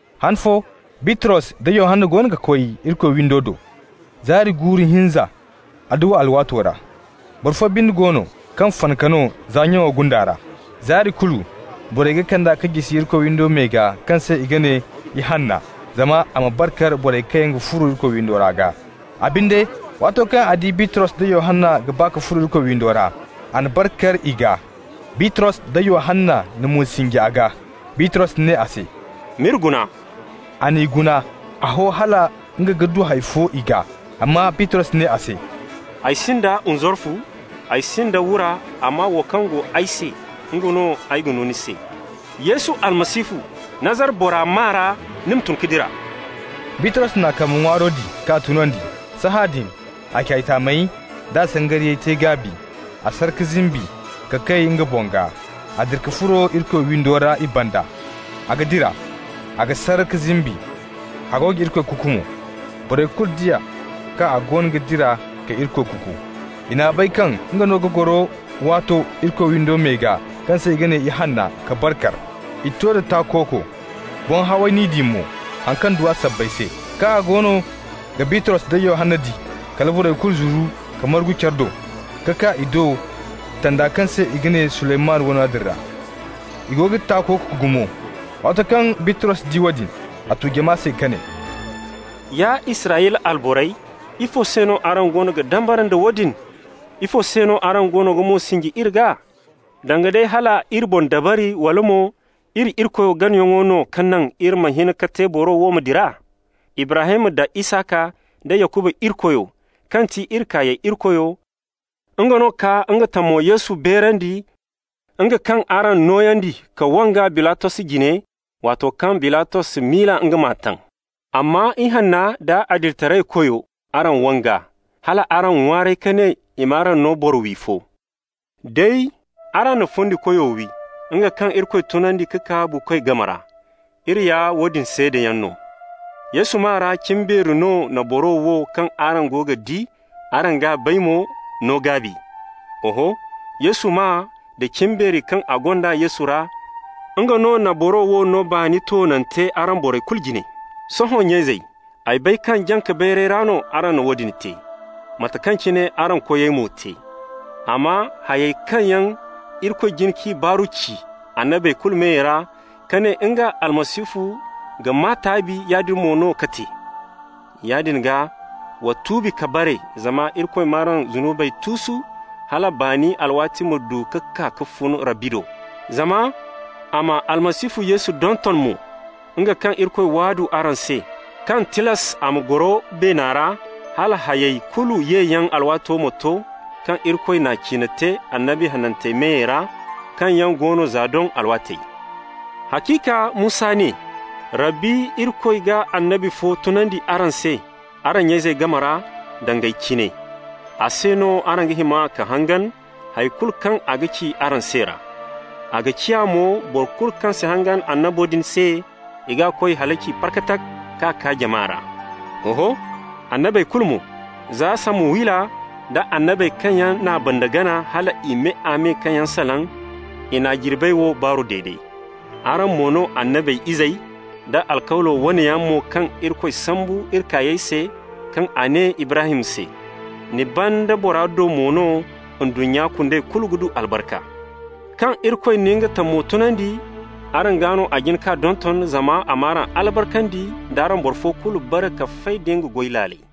Han fo Bitros da Yohanna goono ga koy Irikoy windo do, zaari guuru hinza, adduwa alwaato ra. Boro fo binde go no kaŋ fanaka no za nyaŋo gunda ra. Zaari kulu borey ga kand'a ka jisi Irikoy windo me gaa kaŋ se i ga ne Ihanna, zama a ma bar kar borey kaŋ yaŋ ga furo windo ra gaa. A binde, waato kaŋ a di Bitros da Yohanna ga ba ka furo Irikoy windo ra, a na bar kar i gaa. Bitros da Yohanna na mo sinji a gaa. Bitros ne a se: «M'iri guna.» A n'i guna, a ho hala nga ga du hay fo i gaa. Amma Bitros ne a se: «Ay sinda nzarfu, ay sinda wura, amma wo kaŋ go ay se, nga no ay ga no ni se. Yesu Almasihu, Nazara bora maa ra, ni ma tun ka dira!» Bitros n'a kambe ŋwaaro di k'a tunandi. Sahãadin a ce taamey d'a sangariyey te gaabi. A sar ka zimbi ka kay nga boŋ gaa. A dira ka furo Irikoy windo ra i banda. A ga dira, a ga sar ka zimbi, a go ga Irikoy kuuku mo. Borey kulu di a kaŋ a goono ga dira ka Irikoy kuuku. I n'a bay kaŋ nga no ga goro waato Irikoy windo me gaa kaŋ se i ga ne Ihanna ka bar kar. I to da takooko, boŋ haway n'i di mo haŋ kaŋ du a sabbay se. Kaŋ a goono ga Bitros da Yohanna di, kala borey kulu zuru ka margu care do, ka kaa i do tanda kaŋ se i ga ne Suleymanu wane din ra. I go ga takooko gumo. Waato kaŋ Bitros di woodin, a tu jama se ka ne: «Ya Israyla alborey, ifo se no araŋ goono ga dambara nda woodin? Ifo se no araŋ goono ga mo sinji iri gaa, danga day hal iri boŋ dabari, wala mo iri Irikoy ganayaŋo no ka naŋ iri ma hin ka te boro wo ma dira? Ibrahim da Isaka nda Yakuba Irikoyo, kaŋ ti iri kaayey Irikoyo, nga no ka nga tamo Yesu beerandi, nga kaŋ araŋ nooyandi ka wang'a Bilatos jine, waato kaŋ Bilatos miila nga m'a taŋ. Amma Ihanna da Adilitaraykoyo, araŋ wang'a, hal araŋ ŋwaaray ka ne i m'araŋ no boro-wi fo. Day araŋ na Fundikoyo wi, nga kaŋ Irikoy tunandi ka kaa buukoy game ra. Iri ya woodin seedayaŋ no. Yesu maa ra cimbeeri no na boro wo, kaŋ araŋ go ga di, araŋ g'a bay mo, no gaabi. Oho, Yesu maa da cimbeeri kaŋ a gonda Yesu ra, nga no na boro wo no baani toonante araŋ borey kulu jine. Sohõ, nya-izey, ay bay kaŋ jaŋ-ka-bayyaŋ ra no araŋ na woodin te, mate kaŋ cine araŋ koyey mo te. Amma hayey kaŋ yaŋ Irikoy jin k'i baaru ci annabey kulu meyey ra, ka ne nga Almasihu ga maa taabi, yaadin mo no ka te. Yaadin gaa, wa tuubi ka bare, zama Irikoy m'araŋ zunubey tuusu, hala baani alwaati ma du ka kaa ka fun Rabbi do. Zama a ma Almasihu Yesu donton mo, nga kaŋ Irikoy waadu araŋ se, kaŋ tilas a ma goro beena ra hala hayey kulu yeyaŋ alwaato ma to kaŋ Irikoy n'a ciine te annabi hanantey meyey ra, kaŋ yaŋ go no za doŋ alwaatey. Haciika Musa ne: ‹Rabbi Irikoy ga annabi fo tunandi araŋ se araŋ nya-izey game ra, danga ay cine. A se no araŋ ga hima ka hangan hay kulu kaŋ a ga ci araŋ se ra. A ga ciya mo, boro kulu kaŋ si hangan annabo din se, i g'a koy halaci parkatak, k'a kaa jama ra.› Oho, annabey kulu mo, za Samuwila da annabey kaŋ yaŋ n'a banda gana, hal i me-a-me kaŋ yaŋ salaŋ, i na jirbey wo baaru dede. Araŋ mo no annabey izey, da alkawlo wane yaŋ mo kaŋ Irikoy sambu iri kaayey se, kaŋ a ne Ibrahim se: ‹Ni banda bora do mo no ndunnya kundey kulu ga du albarka.› Kaŋ Irikoy na nga tamo tunandi, araŋ gaa no a jin k'a donton, zama a m'araŋ albarkandi d'araŋ boro fo kulu bare ka fay da nga goy laaley.»